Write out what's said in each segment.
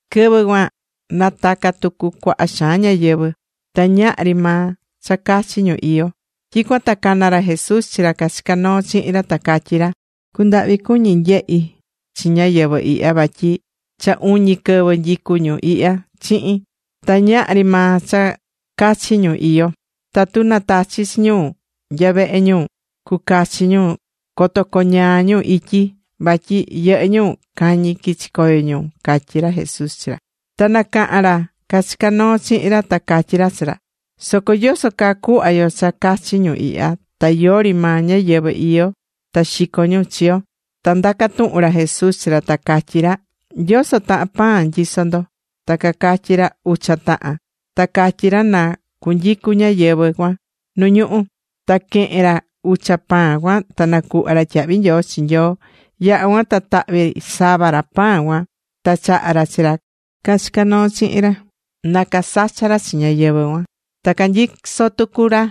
Quɨvɨ cuan nataca̱ tucu cuaha xaan ñáyɨvɨ. Ta ñahri maa cha cachi ñu iyó. Tyicuan ta cana̱ ra Jesús chi ra cachicá noo chihin ra, ta catyí ra: ―Cundahvi cuñí nyehi chi ñáyɨvɨ ihya, vatyi cha uñi quɨvɨ nyicú ñu ihya chihin, ta ñahri maa cha cachi ñu iyó. Tatu natachi chi ñu nya vehe ñu cucachi ñu, coto coñaa ñu ityi, vatyi yɨhɨ́ ñu cañi quichi̱ coyo ñu ―catyí ra Jesús chi ra. Ta nacaha̱n ra cachicá noo chihin ra, ta catyí ra chi ra: ―¿Soco yoso caa cuhva yo cha cachi ñu ihya, ta yori maa ñáyɨvɨ iyó ta xico ñu chi yo? Ta ndaca̱ tuhun ra Jesús chi ra, ta catyí ra: ―¿Yoso tahan pan nyisó ndo? Ta cacatyí ra: ―Ucha tahan. Ta catyí ra na cunyicu ñáyɨvɨ cuan nu ñuhú. Ta quehe̱n ra ucha pan cuan, ta nacuhva̱ ra tyahvi nyoo chi Nyoo. Yaha̱ cuan ta tahvi̱ sava ra pan cuan, ta chaha̱ ra chi ra cachicá noo chihin ra, na casacha ra chi ñáyɨvɨ cuan. Ta canyisó tucu ra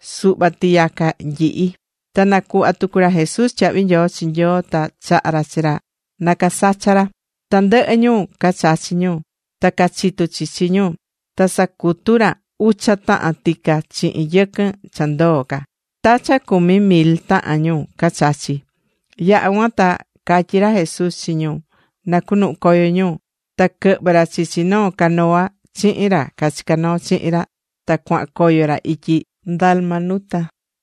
suhva tiyaca nyihi. Ta nacuhva̱ tucu ra Jesús tyahvi nyoo chi Nyoo, ta chaha̱ ra chi ra na casacha ra. Tandɨhɨ ñu cachachi̱ ñu, ta cachitu chichi ñu. Ta casacutu ra ucha tahan tica chihin yɨquɨn cha ndoo ca. Ta cha cumi mil tahan ñu cachachi̱. Yaha̱ cuan ta catyí ra Jesús chi ñu na cunuhu coyo ñu. Ta quɨhvɨ̱ ra chichi noo canoa chihin ra cachicá noo chihin ra. Ta cuahan coyo ra ityi Dalmanuta.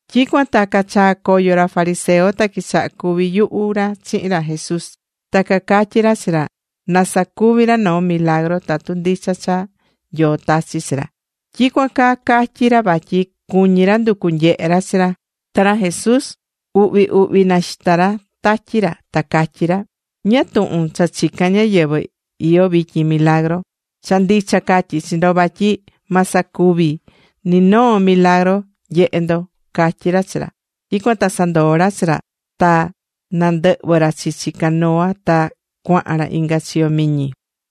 Tyicuan ta cachaa̱ coyo ra fariseo, ta quichaha cuvi yuhu ra chihin ra Jesus. Ta cacatyí ra chi ra na sacuvi ra noo milagru tatu ndicha cha Nyoo tachi̱ chi ra. Tyicuan caa catyi̱ ra vatyi cuñí ra nducu nyehe ra chi ra. Ta ra Jesús uhvi uhvi naxita̱ ra tatyi ra, ta catyí ra: ―¿Ñáá tuhun cha chicán ñáyɨvɨ iyó vityin milagru? Cha ndicha catyí chi ndo vatyi ma sacuvi ni noo milagru nyehe ndo ―catyí ra chi ra. Tyicuan ta sandoo̱ ra chi ra, ta nandɨhvɨ̱ ra chichi canoa ta cuahan ra inga chiyo miñi.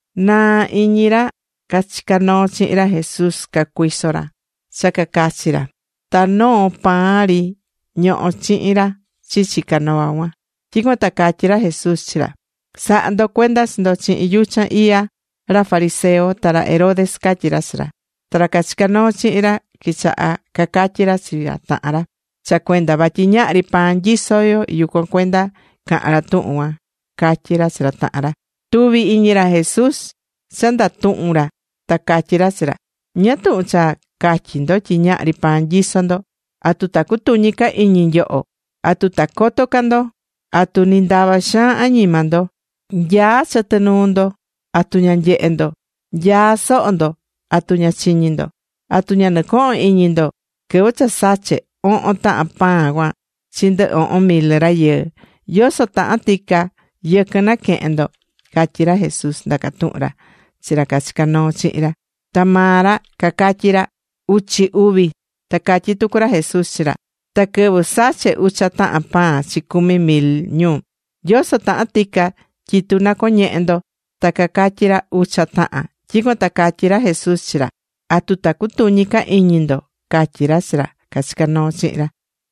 Naa iñi ra cachicá noo chihin ra Jesús cacuiso ra cha cacachi ra. Ta noo pan ri ñohó chihin ra chichi canoa cuan. Tyicuan ta catyí ra Jesús chi ra: ―Sa̱ha ndo cuenda chi ndo chihin yuchan iya ra fariseo ta ra Herodes ―catyí ra chi ra. Ta ra cachicá noo chihin ra quichaha cacatyi ra chi ra tahan ra: ―Cha cuenda vatyi ñahri pan nyisó yo, yucuan cuenda caha̱n ra tuhun cuan ―catyí ra chi ra tahan ra. Tuví iñi ra Jesús cha ndatuhún ra, ta catyí ra chi ra: ―¿Ñáá tuhun cha catyí ndo tyi ñahri pan nyisó ndo? ¿Atu ta cutuñi ca iñi nyoho? ¿Atu ta coto ca ndo? ¿Atu ni ndava xaan añima ndo? Nyaá chɨtɨ nuu ndo, ¿atu ña nyehé ndo? Nyaá soho ndo. ¿Atu ña chiñí ndo? ¿Atu ña nɨcohon iñi ndo quɨvɨ cha sache̱ ohon tahan pan cuan chi ndɨ ohon mil rayɨɨ? ¿Yoso tahan tica yɨquɨn naquehe̱n ndo? ―catyí ra Jesús, ndacá tuhun ra chi ra cachicá noo chihin ra. Ta maa ra cacatyí ra: ―Uchi uvi. Ta catyí tucu ra Jesús chi ra: ―Ta quɨvɨ sache̱ ucha tahan pan chi cumi mil ñu, ¿yoso tahan tica tyitu nacoñehe̱ ndo? Ta cacatyí ra: ―Ucha tahan. Tyicuan ta catyí ra Jesús chi ra: ―¿Atu ta cutuñi ca iñi ndo? ―catyí ra chi ra cachicá noo chihin ra.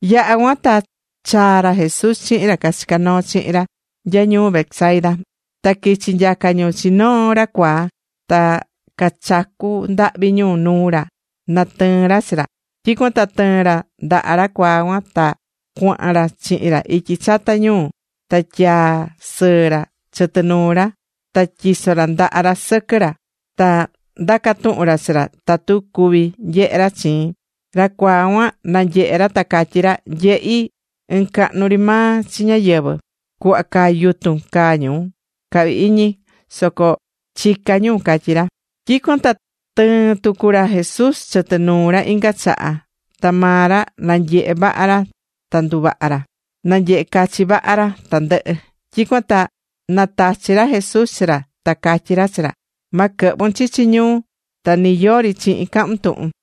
Yaha̱ cuan ta chaa̱ ra Jesús chihin ra cachicá noo chihin ra nya ñuu Betsaida. Ta quichi̱ nyaca ñu chi noo ra cuaa. Ta cachacu̱ ndahvi ñu nuu ra na tɨɨn ra chi ra. Tyicuan ta tɨɨ̱n ra ndaha ra cuaa cuan, ta cuahan ra chihin ra ityi chata ñuu. Ta tyaa̱ sɨɨ ra chɨtɨ nuu ra, ta tyiso̱ ra ndaha ra sɨquɨ ra, ta ndaca̱ tuhun ra chi ra tatu cuví nyehe ra chiin. Ra cuaa cuan nanyehe̱ ra ta catyí ra: ―Nyehí ɨn cahnu ri maa chi ñáyɨvɨ. Cuhva caa yutun caa ñu cahvi iñi, soco chicá ñu ―catyí ra. Tyicuan ta tɨɨ̱n tucu ra Jesús chɨtɨ nuu ra inga chaha, ta maa ra nanyehe̱ vaha ra ta nduvaha̱ ra. Nanyehe cachi vaha ra tandɨhɨ. Tyicuan ta natachi ra Jesús chi ra ta catyí ra chi ra: ―Ma quɨ̱hvun chichi ñuu ta ni yori chihin cahun tuhun.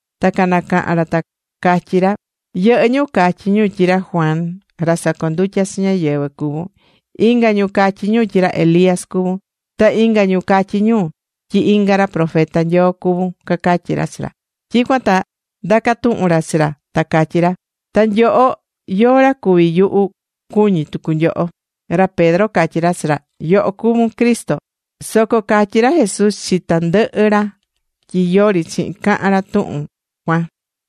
Ta canacaha̱n ra ta catyí ra: ―Yɨhɨ́ ñu catyí ñu tyi ra Juan ra sacondutyá chi ñáyɨvɨ cuvún. Inga ñu catyí ñu tyi ra Elías cuvún. Ta inga ñu catyí ñu tyi inga ra profeta Nyoo cuvún ―cacatyí ra chi ra. Tyicuan ta ndaca̱ tuhun ra chi ra, ta catyí ra: ―¿Ta nyoho, yóó ra cuví yuhu, cuñí tucu nyoho? Ra Pedro catyí ra chi ra: ―Yoho cuví Cristo. Soco catyi ra Jesús chi tandɨhɨ ra tyi yori chihin cacahan ra tuhun cuan.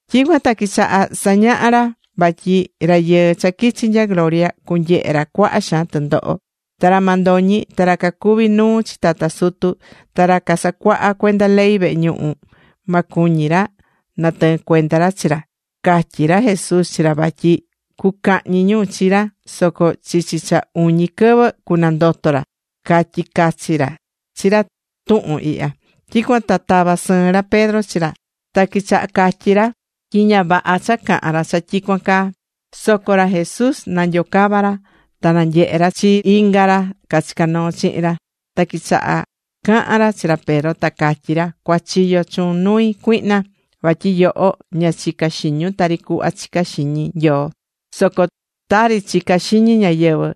Tyicuan ta quichaha̱ sañaha ra vatyi Rayɨɨ cha quichi̱ nya gloria cunyehe ra cuaha xaan tɨndoho. Ta ra mandoñi ta ra cacuví nuu chi tata sutu ta ra casacuahá cuenda ley vehe ñuhu ma cuñi ra natɨɨn cuenda ra chi ra. Catyi̱ ra Jesús chi ra vatyi cucahñi ñu chi ra soco chichi cha cu uñi quɨvɨ cunandoto ra. Catyi̱ cachi ra chi ra tuhun ihya. Tyicuan ta tava̱ sɨɨn ra Pedro chi ra ta quichaha catyi ra tyi ña vaha cha cahan ra cha tyicuan caa. Soco ra Jesús nanyocava̱ ra, ta nanyehe̱ ra chi inga ra cachicá noo chihin ra. Ta quichaha cahan ra chi ra Pedro ta catyí ra: ―¡Cua̱chiyo chuun nui, cuihna! Vatyi yoho ña chicá xiñun tari cuhva chicá xiñi Nyoo, soco tari chicá xiñi ñáyɨvɨ,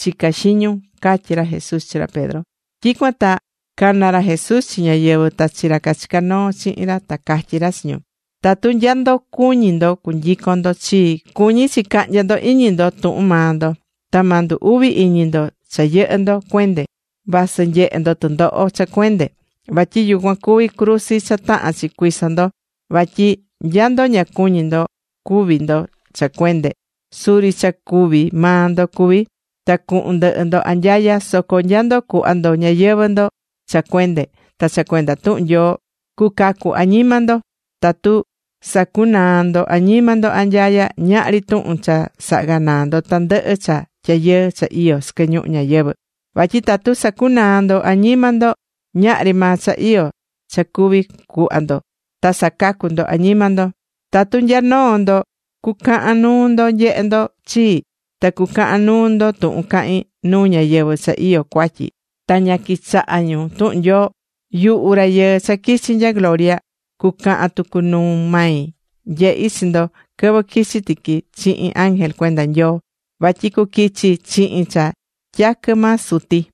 chicá xiñun ―catyí ra Jesús chi ra Pedro. Tyicuan ta cana̱ ra Jesús chi ñáyɨvɨ ta chi ra cachicá noo chihin ra ta catyí ra chi ñu: ―Tatu nya ndo cuñí ndo cunyicon ndo chii, cuñí chi cahnya ndo iñi ndo tuhun maa ndo. Ta ma ndu uvi iñi ndo cha yɨhɨ́ ndo cuende vasɨ nyehe ndo tɨndoho cha cuende. Vatyi yucuan cuví cruzi cha tahán chi cuiso ndo. Vatyi nya ndo ña cuñí ndo cúvi ndo cha cuende, suri cha cúvi maa ndo cuvi, ta cuhun ndɨhɨ ndo anyaya. Soco nya ndo cuhva ndo ñayɨvɨ̱ ndo cha cuende ta cha cuenda tuhun Nyoo, cucacu añima ndo. Tatu sacunaa ndo añima ndo anyaya, ¿ñáá ri tuhun cha saha ganaa ndo tandɨhɨ cha tyayɨɨ cha iyó sɨquɨ ñuhu ñayɨvɨ̱? Vatyi tatu sacunaa ndo añima ndo, ñahri maa cha iyó cha cuví cuhva ndo ta sacacu ndo añima ndo. Tatu nya noo ndo cucahan nuu ndo nyehe ndo chii, ta cucahan nuu ndo tuhun cahín nuu ñáyɨvɨ cha iyó cuatyi ta ña quichahá tuhun Nyoo, yuhu Rayɨɨ cha quichi̱ nya gloria cucahan tucu nuu mai nyehi chi ndo quɨvɨ quichi tiqui chihin ángel cuenda Nyoo. Vatyi cuquichi chihin cha tyaquɨ maa Suti.